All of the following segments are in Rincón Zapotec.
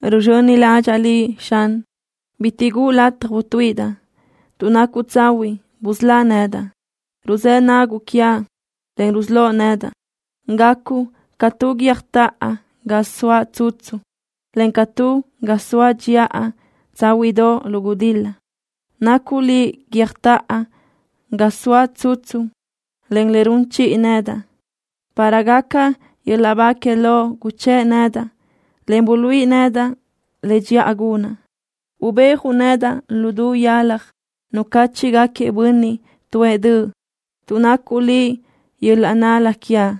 Ruzxöni ládxaʼa Liʼ, Xan. Bitiʼ guʼu lataj utuíʼidaʼ. Tuʼ nacuʼ tsahuiʼ, busölá nedaʼ. Ruzë́ naguʼ quiaʼ, en rusölóʼ nedaʼ. Gacuʼ ca tu guiö́jtoʼo ga soaʼ tsutsu, en ca tu ga soaʼ dxiʼa tsáhuiʼdoʼ lu gudil-la. Nacuʼ Liʼ guiö́jtoʼo ga zoaʼ tsutsu, en le run chiʼi nedaʼ. Para gaca yöl-laʼ ba que Loʼ guchë́ʼ nedaʼ, en buluíʼi nedaʼ le dxiʼa gunaʼ. Ubéajuʼ nedaʼ lu du yalaj nucáchiʼgaquiëʼ bönniʼ tuʼë döʼ, tuʼ nacuʼ Liʼ yöl-laʼ nál-la quiaʼ.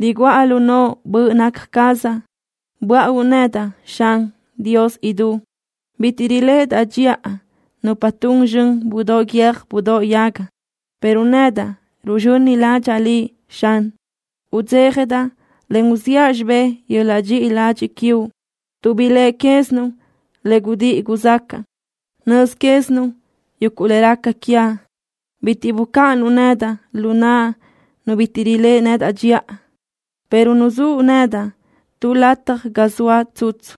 Riguʼa lu noʼo böʼ naca cazaʼ. Böáʼauʼ nedaʼ, Xan, Dios idú. Bitiʼ riléʼedaʼ dxiʼa nupa tun zxön budóʼ guiö́j budóʼ yaga, pero nedaʼ ruzxöni ládxaʼa Liʼ, Xan. Udzéjadaʼ, en uziʼa xibé yöl-laʼ dxiʼi ladxiʼ quiuʼ, tuʼ biléʼe quézinuʼ le gudíʼi guzxácaʼa. Nöz quézinuʼ yuguʼ le raca quiaʼ. Bitiʼ bucáʼanuʼ nedaʼ lu naʼ nu bitiʼ riléʼe nedaʼ dxiʼa, pero nuzúʼ nedaʼ tu lataj ga zoaʼ tsutsu.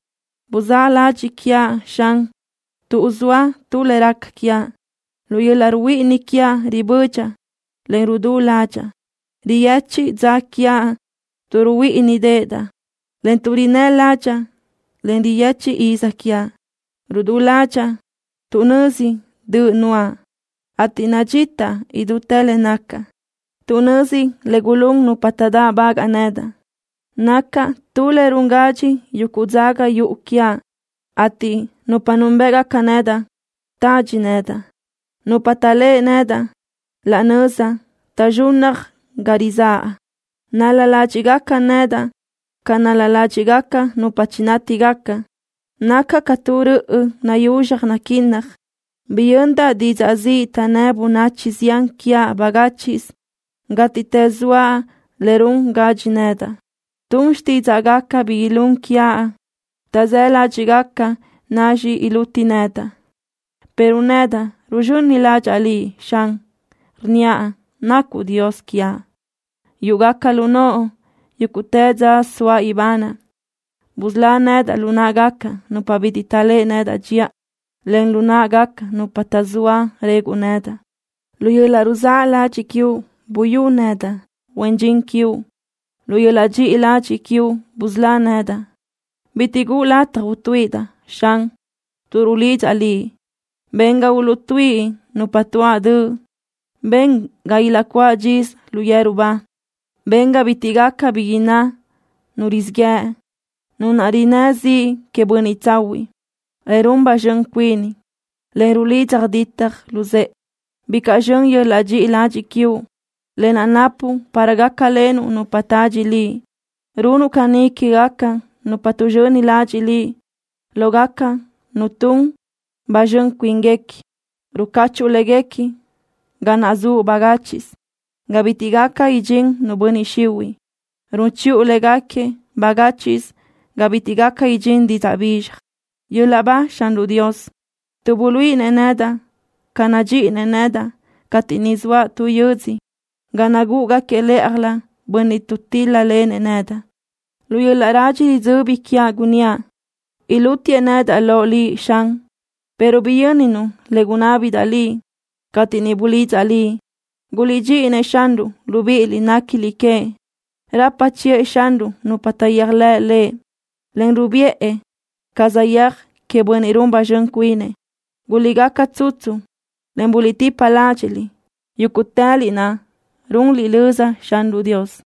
Buzáʼ ladxiʼ quiaʼ, Xan, tuʼ zoa tu le raca quiaʼ. Lu yöl-laʼ ruhuíʼini quiaʼ ribödxaʼ, en rudú ládxaʼa. Riyechiʼ dza quiaʼ tuʼ ruhuíʼinideʼedaʼ, en tuʼ rinnë́ ládxaʼa, en riyechiʼ iz quiaʼ. Rudú ládxaʼa tuʼ nözi döʼ nuʼa, ateʼ nadxita idútë le nacaʼ. Tuʼ nözi le gulún nupa taʼdáʼbagaʼ nedaʼ nacaʼ tu le run gadxi yuguʼ dzaga yuʼu quiaʼ, ateʼ nupa núnbëʼgaca nedaʼ tadxi nedaʼ. Nupa taʼléʼe nedaʼ laʼ nöza taʼzxunnaj ga rizáʼa. Nál-la ládxiʼgaca nedaʼ ca nál-la ládxiʼgaca nupa chinátigaca. Nacaʼ ca tu röʼö nayuzxaj naguinnaj. Biyöndaʼ didzaʼ ziʼ taʼnnë́ bönachi zián quiaʼ bagáchiʼsö. Gátiʼtës zoa le run gadxi nedaʼ. Tun xtídzaʼgaca bi ilún quiaʼ. Taʼzáʼ ládxiʼgaca nacxi iluti nedaʼ, pero nedaʼ ruzxöni ládxaʼa Liʼ, Xan. Rnníaʼ nacuʼ Dios quiaʼ. Yúʼugaca lu noʼo yúguʼtë dza soaʼ ibanaʼ. Busölá nedaʼ lu náʼagaca nupa bitiʼ taʼléʼe nedaʼ dxiʼa, en lu náʼagaca nupa taʼzóa reguʼ nedaʼ. Lu yöl-laʼ ruzáʼ ladxiʼ quiuʼ buyú nedaʼ, huen dxin quiuʼ. Lu yöl-laʼ dxiʼi ladxiʼ quiuʼ busölá nedaʼ. Bitiʼ guʼu lataj utuíʼidaʼ, Xan, tuʼ rulidzaʼ Liʼ. Ben ga uluʼtuíʼi nupa tuáʼ döʼ. Ben ga ilaʼcuáʼ dxisö lu yeru ba. Ben ga bitiʼ gaca bi inná nu rizíʼ yëʼ, nu naʼ rinnë́ ziʼ queëʼ bönniʼ tsahuiʼ, en run ba zxön cuini, en rulidza ditaj luzë́ʼe. ¡Bicaʼ zxön yöl-laʼ dxiʼi ladxiʼ quiuʼ, lë naʼ napuʼ para gácalenuʼ nupa tadxi Liʼ! Runuʼ caní quégaca nupa tuʼzxöni ladxiʼ Liʼ lógaca nupa tun ba zxön cuíniguequi. Rucáchuʼu légaquiëʼ ga naʼ zuʼ bagáchiʼsö, ga bitiʼ gaca idxín nu bönniʼ xihuiʼ. Run chiʼu légaquiëʼ bagáchiʼsö ga bitiʼ gaca idxín didzaʼ bizxaj. ¡Yöl-laʼ ba Xanruʼ Dios, tuʼ buluíʼinëʼ nedaʼ ca nadxíʼinëʼ nedaʼ cateʼ niʼ zoaʼ tu yödzö ga nagúʼugaquiëʼ lë́ʼajlö bönniʼ tuʼtíl-lalenëʼ nedaʼ! Lu yöl-laʼ radxi ridzöbi quiaʼ gunníaʼ: “Ilútiëʼ nedaʼ loʼ Liʼ, Xan”, pero biyönnuʼ le gunábidaʼ Liʼ, cateʼ niʼ bulidzaʼ Liʼ. ¡Guliʼdxíʼi-nëʼ Xanruʼ, libíʼiliʼ néquiliʼ queëʼ! Rapa chiʼë Xanruʼ nupa taʼyéajlëʼ Lëʼ, en rubiʼë ca saʼyéaj queëʼ bönniʼ run ba zxön cuinëʼ. ¡Guliʼgaca tsutsu, en buliʼtipa ládxiʼliʼ, yúguʼtëliʼ naʼ runliʼ löza Xanruʼ Dios!